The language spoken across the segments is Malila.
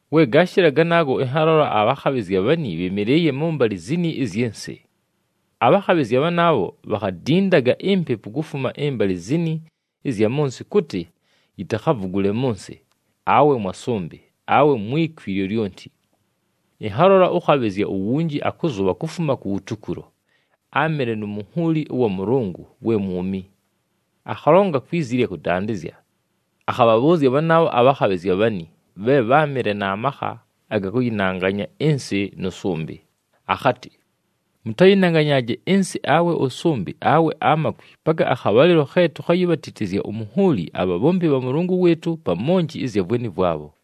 We gaashɨla ganaago, ɨnhalola abhakhabhɨzya bhani bhɨmɨlɨɨye mʉmbalɨ zini ɨzyɨ nsɨ. Abhakhabhɨzya bhanaabho bhakhadindaga impepu kufuma ɨmbalɨ zini ɨzya mʉ nsɨ kʉtɨ yitakhavugule mʉ nsɨ, awe mwa sʉmbɨ, awe mwi kwi lyolyonti. Ɨnhalola ʉkhabhɨzya uwunji akʉzʉbha kufuma kuwutukulo, áamɨle nu munhuuli ʉwa Mʉlʉngʉ we mwumi. Akhalonga kwi zi ɨlya kʉdandɨzya akhabhabhʉʉzya bhanaabho abhakhabhɨzya bhani, bhe bháamɨle na makha aga kʉyɨnanganya ɨnsɨ nʉ sʉmbɨ, akhatɨ, “Mʉtayɨnanganyaaje ɨnsɨ awe ʉsʉmbɨ awe amakwi, paka akhabhalɨlo khe tukhayibhatitizya umunhuuli abhabhombi bha Mʉlʉngʉ wɨɨtʉ pa monji ɨzya vweni vwabho.”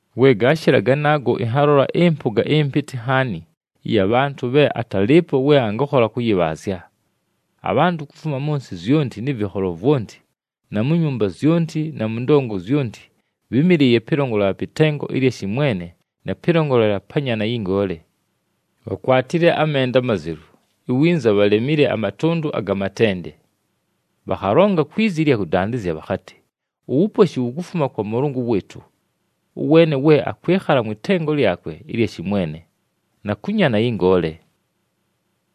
We gaashɨla ganaago, ɨnhalola ɨmpʉga ɨmpɨtɨ nhaani ɨya bhantʉ bhe atalɨɨpo we angakhola kʉyɨbhaazya. Abhantʉ kufuma mʉ nsɨ zyonti nɨ vɨkholo vwonti na mu nyumba zyonti na mʉ ndongo zyonti, bhɨ́mɨlɨɨye pɨlongolela pɨ tengo ɨlya shɨmwene na pɨlongolela pa Nyaana yɨ Ngoole. Bhakwatile amenda amazelu, iwinza bhalemile amatʉndʉ aga matende. Bhakhalonga kwi zi ɨlya kʉdandɨzya bhakhatɨ, “Uwuposhi wukufuma kwa Mʉlʉngʉ wɨɨtʉ, ʉweene we akwɨkhala mwɨ tengo lyakwe ɨlya shɨmwene, na kʉ Nyaana yɨ Ngoole.”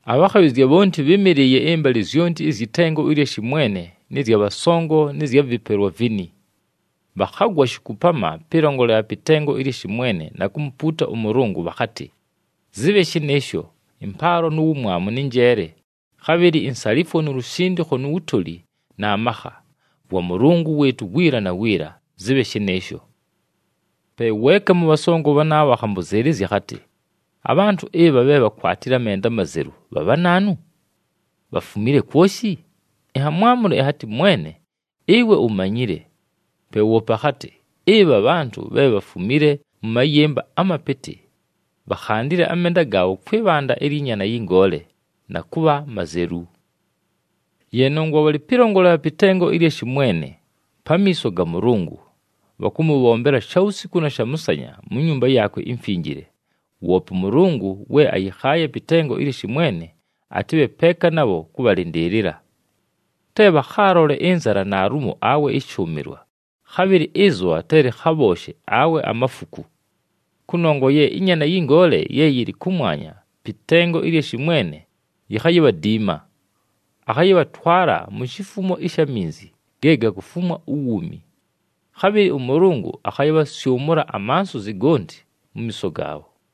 Abhakhabhɨzya bhonti bhɨ́mɨlɨɨye ɨmbalɨ zyonti ɨzyɨ tengo ɨlya shɨmwene nɨ zya bhasongo nɨ zya vɨpelwa vini. Bhakhagwa shikupama pɨlongolela pɨ tengo ɨlya shɨmwene na kumupuuta ʉMʉlʉngʉ, bhakhatɨ, “Zɨbhe shɨnɨɨsho! Ɨmpaalo nu wumwamu nɨ njeele, khabhɨlɨ insalifwo nu lushindikho nu wutoli na makha, vwa Mʉlʉngʉ wɨɨtʉ wiila na wiila. Zɨbhe shɨnɨɨsho!” Pe weeka mʉ bhasongo bhanaabho, akhambʉzɨɨlɨzya akhatɨ, “Abhantʉ ɨbha bhe bhakwatile amenda amazelu bha bhanaanu? Bhafumile kwoshi?” Ɨnhamwamʉla ɨnhatɨ, “Mwene, ɨwe umanyile.” Pe woope akhatɨ, “Ɨbha bhantʉ, bhe bhafumile mʉ mayɨmba amapɨtɨ. Bhakhandile amenda gaabho kwɨ bhanda lyɨ Nyaana yɨ Ngoole na kʉbha mazelu. Ye nongwa bhalɨ pɨlongolela pɨ tengo ɨlya shɨmwene, pamiiso ga Mʉlʉngʉ. Bhakʉmʉbhombela shawusiku na shamʉsanya mu Nyumba yaakwe iMfinjile, woope ʉMʉlʉngʉ we ayɨkhaaye pɨ tengo ɨlya shɨmwene atɨbhe peeka nabho kʉbhalɨndɨɨlɨla. Te bhakhaalole ɨnzala naalumo, awe ɨshʉʉmɨlwa, khabhɨlɨ ɨzʉbha te lɨkhabhooshe, awe amafuku. Kʉnongwa ye ɨNyaana yɨ Ngoole ye yɨlɨ kʉmwanya, pɨ tengo ɨlya shɨmwene yikhayibhadiima. Akhayɨbhatwala mu shifumo ɨsha minzi, ge gakufumwa uwuumi. Khabhɨlɨ ʉMʉlʉngʉ akhayɨbhasyʉmʉla amansuzi gonti mu miiso gaabho.”